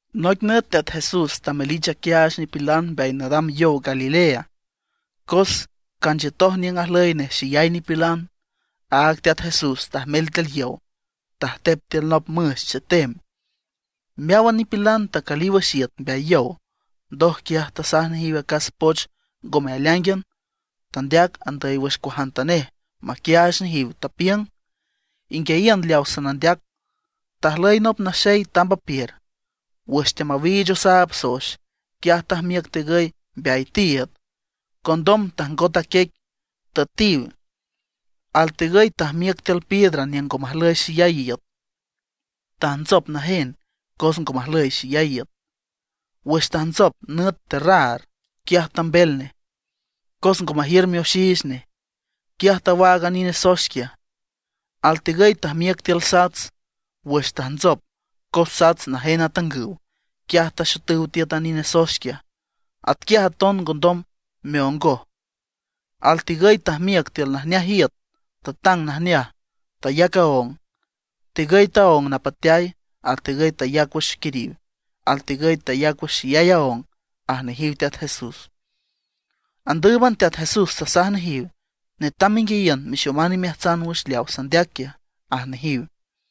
Noic nüt Teat Jesús tamelich aquiaach nipilan mbeay nadam yow Galilea. Cos canchiütoj niüng ajlüy nej xeyay nipilan; áag Teat Jesús tajmel tiül yow, tajtep tiül nop müx chetem. Meáwan nipilan tacüliw wüx iüt mbeay yow. Ndoj quiaj tasaj nejiw acas poch ngome aleáingan, tandeac andüy wüx cuajantanej maquiaach nejiw. Tapiüng: ―Inguiayiün leawa sanandeac: Tajlüy nop naxey tamb apiür. Wüx teamawiich osaab soex, quiaj tajmiüc tigüy mbeay tiiüd. Condom tajngotoj a quiec, tüetiw. Altigüy tajmiüc tiül piedra niüng ngo majlüy xeyay iüt. Tajntsop najen cos ngo majlüy xeyay iüt. Wüx tajntsop nüt terraar, quiaj tambel nej. Cos ngo majiür mioxiich nej, quiaj tawaag a nine soex quiaj. Altigüy tajmiüc tiül sats. Wüx tajntsop, cos sats najen atangüw, quiaj taxotüw tiüt a nine soex quiaj. Atquiaj taton ngondom meongoj. Altigüy tajmiüc tiül najneaj iüt, tatang najneaj, tayac aóng. Tigüy taóng napateay, altigüy tayac wüx quiriw, altigüy tayac wüx xeyay aóng ―aj nejiw Teat Jesús. Andǘüban Teat Jesús tasaj nejiw: ―Netam menguiayiün, mexoman imeajtsan wüx leaw sandeac quiaj ―aj nejiw.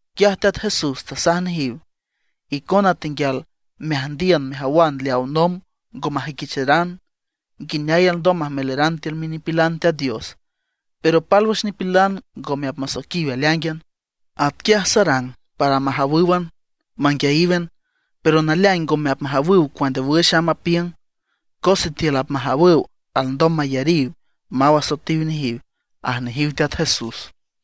Quiaj Teat Jesús tasaj nejiw: ―Icona tenguial meajndiün mejawan leawa nomb ngo majüiquicharan, nguineay alndom majmelaran tiül minipilan Teat Dios. Pero pálwüx nipilan ngome apmasoiquiw aleáingan. Atquiaj sarang para majawǘwan, manguiayíwan, pero naleaing ngome apmajawüw cuane wüx amb apiüng. Cos sitiül apmajawüw, alndom mayariw, maw asoetiw nejiw ―aj nejiw Teat Jesús.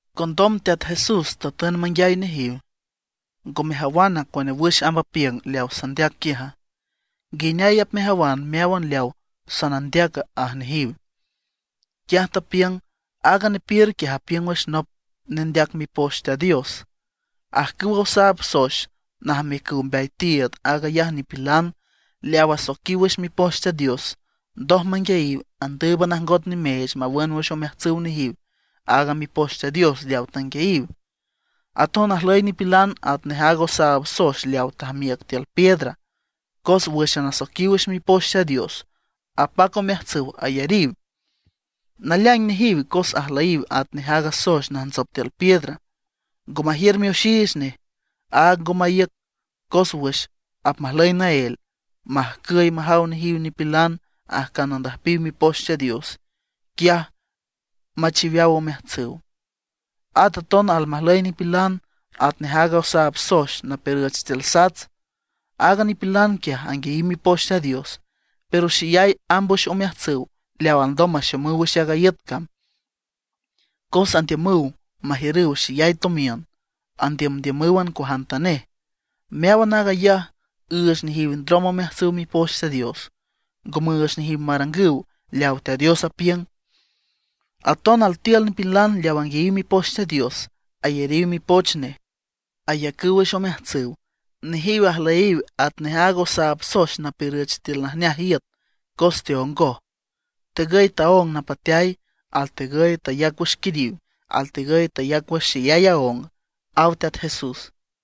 Condom Teat Jesús tatün manguiay nejiw: ―¿Ngo mejawana cuane wüx amb apiüng leawa sandeac quiaja? ¿Nguineay apmejawan meáwan leawa sanandeaca? ―aj nejiw. Quiaj tapiüng: ―Aaga nepiür quiaj apiüng wüx nop nendeac Mipoch Teat Dios. Ajcüwa osaab soex najmiücüw mbeay tiiüd, aag ayaj nipilan leaw asoiquiw wüx Mipoch Teat Dios. Ndoj manguiayiw, andǘüban ajngot nimeech mawün wüx omeajtsüw nejiw aaga Mipoch Teat Dios leawa tanguiayiw. Aton ajlüy nipilan atnej aaga osaab soex leawa tajmiüc tiül piedra. Cos wǘxan asoiquiw wüx Mipoch Teat Dios, apac omeajtsüw ayariw. Naleaing nejiw, cos ajlüyiw atnej aaga soex najntsop tiül piedra, ngo majiür mioxiich nej; áag ngo maíüc. Cos wüx apmajlüy naél, majcüy majaw nejiw nipilan ajcan andüjpiw Mipoch Teat Dios, quiaj machiweaw omeajtsüw. At aton almajlüy nipilan atnej aaga osaab soex napiürüch tiül sats. Aaga nipilan quiaj anguiayiw Mipoch Teat Dios. Pero xeyay amb wüx omeajtsüw leaw alndom maxomüw wüx aaga iüt cam. Cos andiümüw majiürüw xeyay tomiün, andiümdiümǘwan cuajantanej. Meáwan aag ayaj üüch nejiw ndrom omeajtsüw Mipoch Teat Dios; ngo müüch nejiw marangüw leawa Teat Dios apiüng. Aton altiül nipilan leaw anguiayiw Mipoch Teat Dios, ayariw mipoch nej, ayacüw wüx omeajtsüw. Nejiw ajlüyiw atnej aaga osaab soex napiürüch tiül najneaj iüt cos teongoj. Tegüy taóng napateay, altegüy tayac wüx quiriw, altegüy tayac wüx xeyay aóng ―aw Teat Jesús.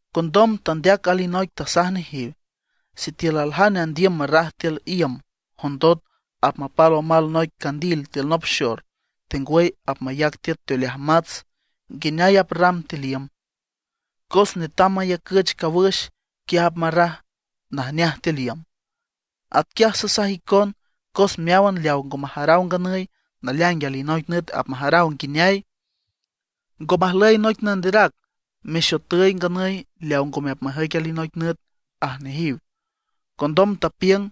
Condom tandeac alinoic tasaj nejiw: ―Sitiül aljane andiüm marraj tiül iüm jondot apmapal omal noic candil tiül nop xor, tengwüy apmayac tiüt teoleaj mats, ¿nguineay aprram tiül iüma? Cos netam mayacüch cawüx, quiaj apmarraj najneaj tiül iüm. Atquiaj sasaj icon, cos meáwan leaw ngo majaraw nganüy, naleaing alinoic nüt apmajaraw nguineay. Ngo majlüy noic nanderac mexotüy nganüy leaw ngome apmajüic alinoic nüt ―aj nejiw. Condom tapiüng: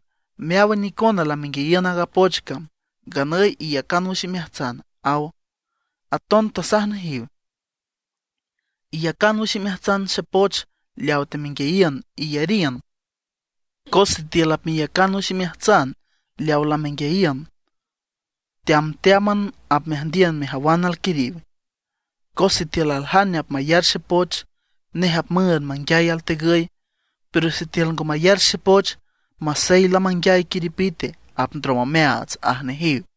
―Meáwan icona lamenguiayiün aaga poch cam, nganüy iyacan wüx imeajtsan ―aw. Aton tasaj nejiw: ―Iyacan wüx imeajtsan xepoch leawa temenguiayiün, iyariün. Cos sitiül apmeyacan wüx imeajtsan leawa lamenguiayiün, teamteáman apmeajndiün mejawan alquiriw. Cos sitiül aljane apmayar xepoch, nej apmüünd manguiay altegüy. Pero sitiül ngo mayar xepoch, masey lamanguiay quiripite apndrom omeaats ―aj nejiw.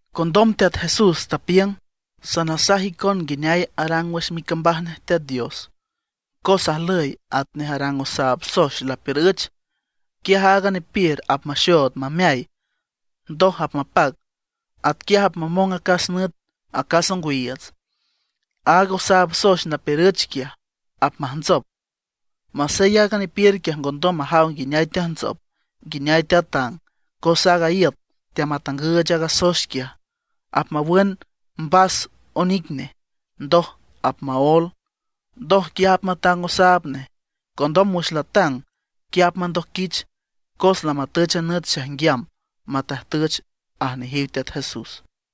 Condom Teat Jesús tapiüng: ―Sanasaj icon nguineay arang wüx micambaj nej Teat Dios. Cos ajlüy atnej arang osaab soex lapiürüch. Quiaj aaga nepiür apmaxood mameay, ndoj apmapac. Atquiaj apmamong acas nüt acas ongwiiüts. Aaga osaab soex napiürüch quiaj apmajntsop, masey aaga nepiür quiaj ngondom majaw nguineay teajntsop, nguineay teatang. Cos aaga iüt teamatangüch aaga soex quiaj. Apmawün mbas onic nej, ndoj apmaól, ndoj quiaj apmatang osaab nej. Condom wüx latang, quiaj apmandojquich cos lamatüch a nüt xaijnguiam matajtüch ―aj nejiw Teat Jesús.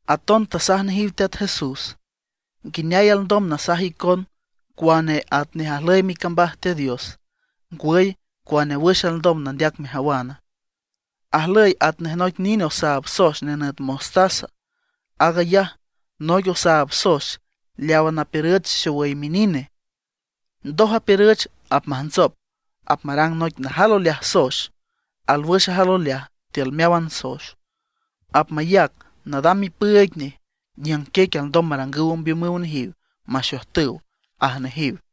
Aton tasaj nejiw Teat Jesús: ―¿Nguineay alndom nasaj icon cuane atnej ajlüy micambaj Teat Dios, ngwüy cuane wüx alndom nandeac mejawan? Ajlüy atnej noic nine osaab soex nenüt mostaza. Aag ayaj noic osaab soex leawa napiürüch xowüy minine. Ndoj apiürüch, apmajntsop, apmarang noic najal oleaj soex, alwüx ajal oleaj tiül meáwan soex. Apmayac nadam mipüüig nej niüng quiec alndom marangüw ombiümüw nejiw maxojtüw ―aj nejiw.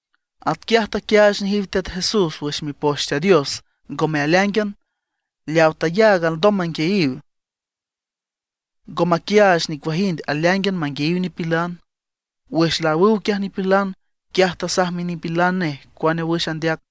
Atquiaj taquiaach nejiw Teat Jesús wüx Mipoch Teat Dios, ngome aleáingan, leaw tayaag alndom manguiayiw. Ngo maquiaach nicuajind aleáingan manguiayiw nipilan. Wüx laawüw quiaj nipilan, quiaj tasaj minipilan nej cuane wüx tandeac.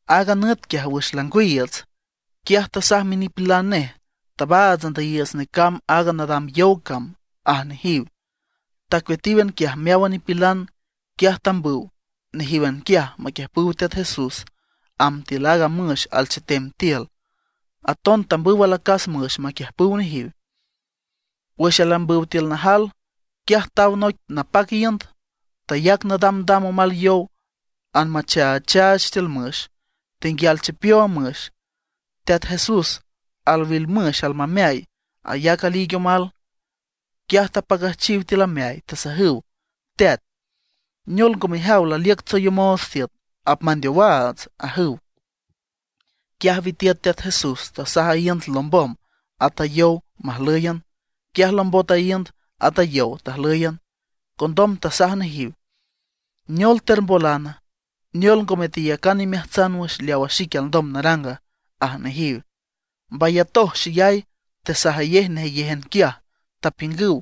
Aaga nüt quiaj wüx langwiiüts, quiaj tasaj minipilan nej: ―Tabaats andüyiiüts necamb aaga nadam yow cam ―aj nejiw. Tacueatíwan quiaj meáwan nipilan. Quiaj tambüw nejíwan quiaj maquiüjpüw Teat Jesús amb tiül aaga müx alchetem tiül. Aton tambüw alacas müx maquiüjpüw nejiw. Wüx aleambüw tiül najal, quiaj taw noic napac iünd, tayac nadamdam omal yow anmachaachaach tiül müx, tenguial chipiow a müx. Teat Jesús al wil müx almameay, ayac aliig omal. Quiaj tapacüjchiw tiül ameay, tasajüw: ―¡Teat! ¿Neol ngo mejaw, laliüc tsoyomoots tiüt? ¡Apmandeowaats! ―ajüw. Quiaj witiüt Teat Jesús, tasaj a iünd lombom, at a yow majlǘyan. Quiaj lombot a iünd, at a yow tajlǘyan. Condom tasaj nejiw: ―¿Neol termbolana, neol ngome teyacan imeajtsan wüx leawa xique alndom naranga? ―aj nejiw. Mbayatoj xeyay, tesajayej nejeyéjan quiaj, tapiüngüw: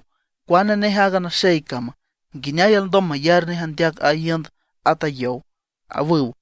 ―¿Cuaane nej aaga naxey cama? ¿Nguineay alndom mayar nej andeac a iünd at a yow? ―awüw.